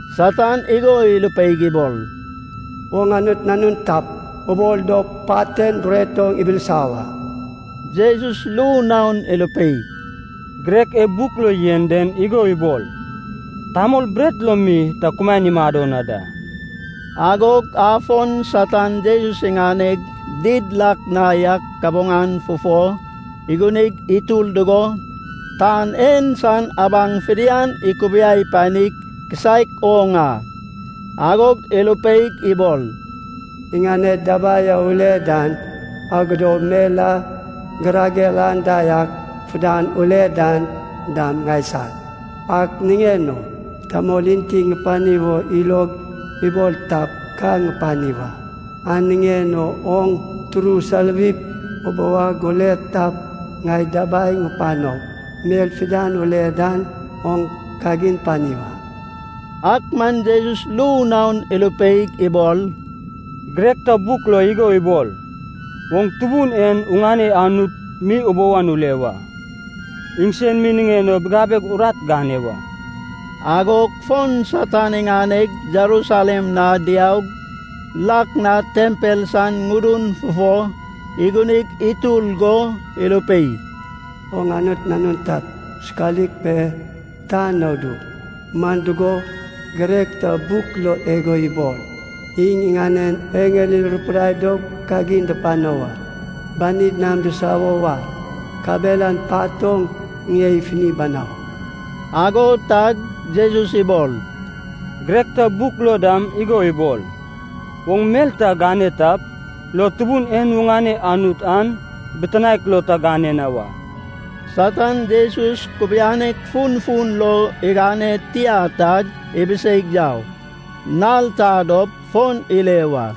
Satan igo irupeig ibol, “Oŋ Anut Nanun tap, ubol dop pat en bret oŋ ibilisa wa.” Jesus ru naon irupei, “Girek e buk lo yen den igo ibol, tamol bret lo mi ta kumaen imado na da.” Agog afon Satan Jesus iŋaneg did lak na yak kabuŋan fufo igunig itur dugo tan en san abaŋ fidian ikubiai pani kisaek oŋ a. Agog irupeig ibol, “Iŋaned dabai a ule dan, agod mel a girager anda yak fidian ule dan dam ŋaisag. Ak niŋen o tamol enti ŋupani wo ilog ibol tap, ka ŋupani wa. An niŋen o oŋ turu soluwip, ubou ag ule tap, ŋai dabai ŋupanop, mel fidian ule dan oŋ kagin pani wa.” Ak man Jesus ru naon irupeig ibol, “Girek ta buk lo igo ibol, ‘Oŋ Tubun en oŋane Anut mi ubou an ule wa. Iŋsen mi niŋen o bigabeg urat gane wa.’” Agog fon Satan iŋaneg Jerusalem na diaug, lak na tempel san ŋudun fufo igunig itur go irupei, “Oŋ Anut nanun tap, sokalik pe, tan na udu. Man dugo, girek ta buk lo igo ibol, ‘Iŋ iŋanen eŋel irupidai dop kagin dupano wa. Banid nam disawo wa, kabelan pat oŋ ŋie ifini banau.’” Ago tag Jesus ibol, “Girek ta buk lo dam igo ibol, oŋ mel ta gane tap lo Tubun en oŋane Anut an bitinaek lo ta gane na wa.” Satan Jesus kubianek funfun lo igane tia tag ibiseig yau. Nal ta dop fon ile wa.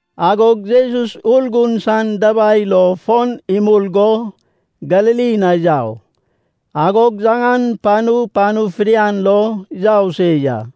Agog Jesus Urgun san dabai lo fon imul go Galili na yau. Agog yaŋan panu panu fidian lo yau se ya.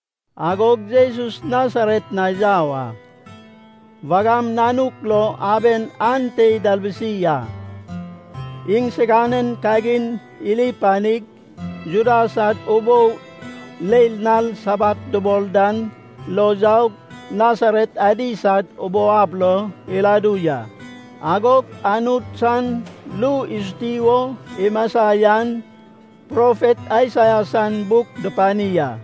Agog Jesus Nasaret na yau a. Wagam nanuk lo aben ante italbusi a. Iŋsiganen kagin iri panig, Juda sad ubou leil nal Sabat dubol dan lo yaug Nasaret adi sad ubou ab lo iladu ya. Agog Anut san ru isuti wo imasa yan, profet Aisaia san buk dupani a.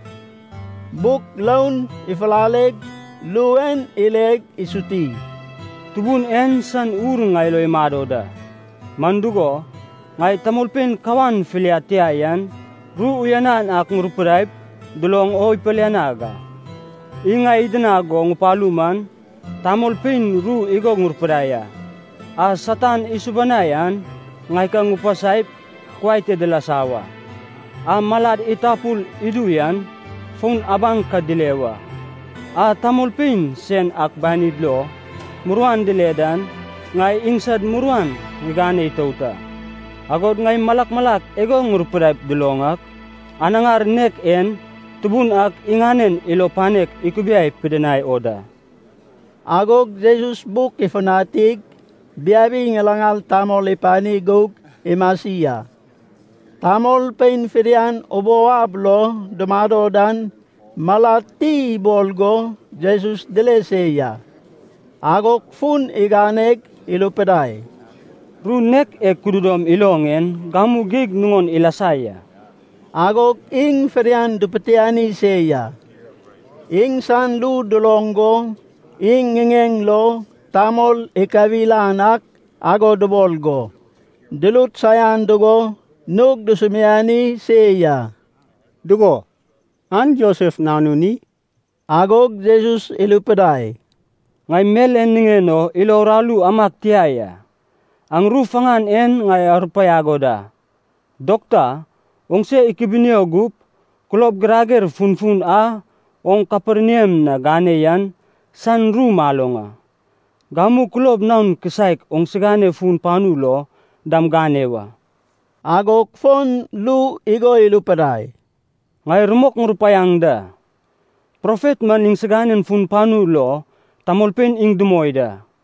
Buk roun ifulaleg, ru en ileg isuti: “Tubun en san Ur ŋai lo imado da. Man dugo, ŋai tamolpein kawan filiad tia yan, ru uyanan ak ŋurupidaip duloŋ o ipilianag a. Iŋ ŋai idinag go ŋupalu man, tamolpein ru igo ŋurupidai a: a Satan isubanai an ŋai ka ŋupasaip kuai te dilasa wa, a malad itapul idu yan fon abaŋ ka dile wa, a tamolpein sen ak banid lo muruan dile dan, ŋai iŋsad muruan ŋigane itout a. Agod ŋai malak malak igo ŋurupidaip duloŋ ak, anaŋar nek en Tubun ak iŋanen ilo panek ikubiai pidinai o da.” Agog Jesus buk ifutanig, biabi ŋilaŋal tamol ipani gug imasi a. Tamolpein fidian ubou ab lo dumado dan malad ti ibol go Jesus dile se ya. Agog fun iganeg irupidai, “Ru nek e kududom iloŋ en gamu geig nuŋon ilasa ya.” Agog iŋ fidian dupitiani se ya, iŋsan ru duloŋ go iŋ ŋiŋeŋ lo tamol ikawil an ak ago dubol go, durut saian dugo nug dusumiani se ya, “Dugo, an Josef nanun i?” Agog Jesus irupidai, “Ŋai mel en niŋen o ilo uraru amag tia ya, aŋ ru faŋan en ŋai arupaiag o da, ‘Dokta, oŋse ikubinio gup! Kulob girager funfun a oŋ Kaperniam na gane yan san ru maloŋ a, gamu kulob naon kisaek oŋsigane fun panu lo dam gane wa.’” Agog fon ru igo irupidai, “Ŋai rumok ŋurupaiaŋ da, profet man iŋsiganen fun panu lo tamolpein iŋ dumoi da.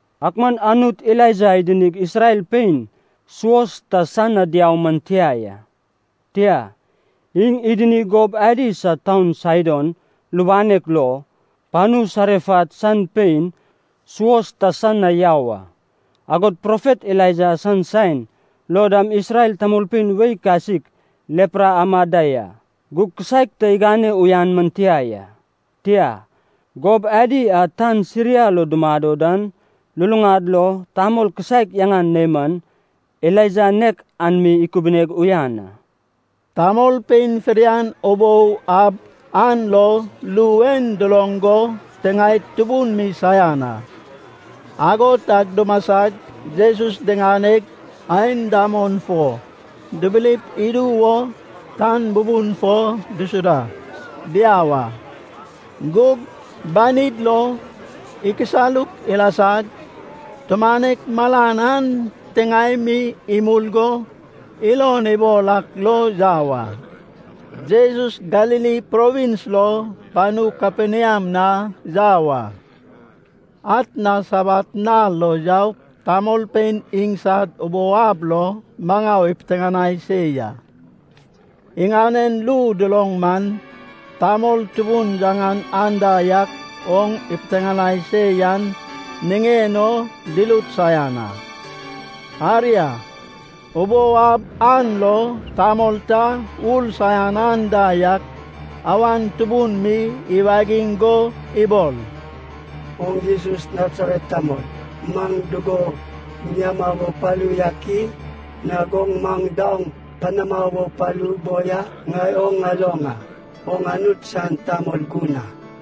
Ak man Anut Elaija idinig Isrel pein suos ta san na yau man tia ya. Tia, iŋ idinig gob adi sad taun Saidon lubanek lo, panu Sarefat san pein suos ta san na yau a. Agod profet Elaija san saen lo dam Isrel tamolpein wei kasik lepra amad da ya. Gug kisaek ta igane uyan man tia ya. Tia, gob adi a tan Siria lo dumado dan luluŋad lo tamol kisaek yaŋan Neman, Elaija nek an mi ikubuneg uyan a.” Tamolpein fidian ubou ab an lo ru en duloŋ go tiŋaed tubun mi saian a. Ago tag dumasag, Jesus diŋaneg, aen damon fo dibilip idu wo tan bubun fo disuda diau a. Gug banid lo ikisaluk ilasag, tumanek malan an titiŋae mi imul go ilon ibol ak lo yau a. Jesus Galili Provins lo panu Kaperniam na yau a. Atna Sabat nal lo yaug tamolpein iŋsad ubou ab lo maŋau ipiteŋanai se ya. Iŋanen ru duloŋ man, tamol tubun yaŋan anda yak oŋ ipiteŋanai se yan niŋen o durut saian a. Aria, ubou ab an lo tamol ta ur saian anda yak awan tubun mi iwagiŋ go ibol, “Oŋ Jesus Nasaret tamol, maŋ dugo giniama wo palu yak i? Nag oŋ maŋ daoŋ panama wo palu boi a? Ŋai oŋ ŋaloŋ a. Oŋ Anut san tamol gun a!”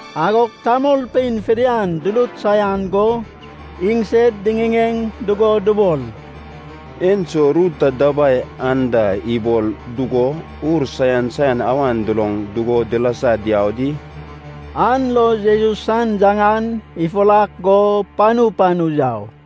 Agog tamolpein fidian durut saian go, iŋsed diŋiŋeŋ dugo dubol, “Enso ru ta dabai anda ibol dugo ur saian saian awan duloŋ dugo dilasa diau di?” An lo Jesus san yaŋan ifurak go panu panu yau.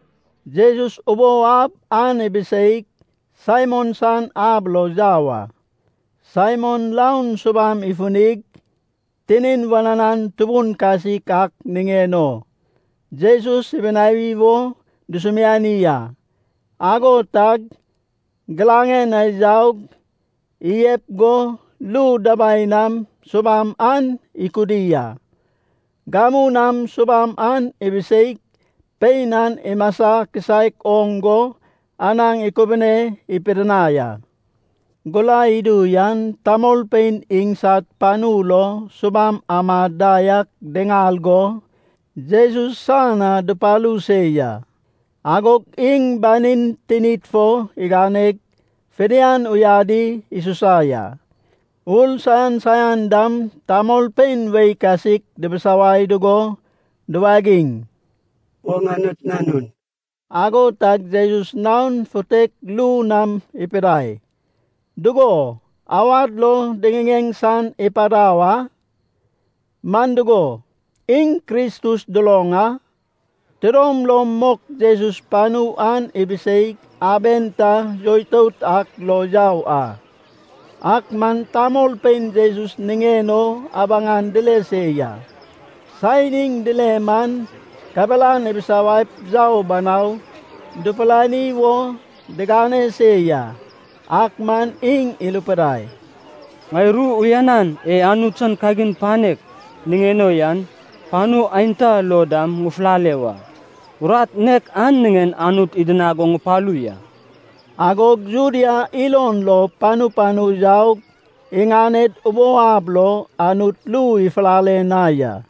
Jesus ubou ab an ibiseig, Saimon san ab lo yau a. Saimon raon subam ifinig, tinin wananan tubun kasik ak niŋen o, Jesus ibinawi wo dusumiani a. Ago tag giraŋen na yaug, iyep go ru dabai nam subam an ikudi a. Gamu nam subam an ibiseig, pein an imasa kisaek oŋ go anaŋ ikubune pidinai a. Gurai idu yan, tamolpein iŋsad panu lo subam amad da yak diŋal go, Jesus san na dupalu se ya. Agog iŋ banin tinid fo iganeg, fidian uyadi isusa ya. Ur saian saian dam tamolpein wei kasik dibisawai dugo duwagiŋ, “Oŋ Anut Nanun.” Ago tag Jesus nao futek ru nam ipidai dugo awad lo diŋiŋeŋ san ipadau a, man dugo, iŋ Kristus duloŋ a. Tidom lom mok Jesus panu an ibiseig, aben ta yoitout ak lo yau a. Ak man tamolpein Jesus niŋen o abaŋ dile se ya. Saen iŋ dile man, kabelan ibisawaip yau banau dupurani wo digane se ya. Ak man iŋ irupidai, “Ŋai ru uyanan e Anut san kagin panek niŋen o yan, panu aenta lo dam ŋufulale wa. Urat nek an niŋen Anut idinag go ŋupalu ya.” Agog Judea ilon lo panu panu yaug iŋaned ubou ab lo Anut ru ifulale na ya.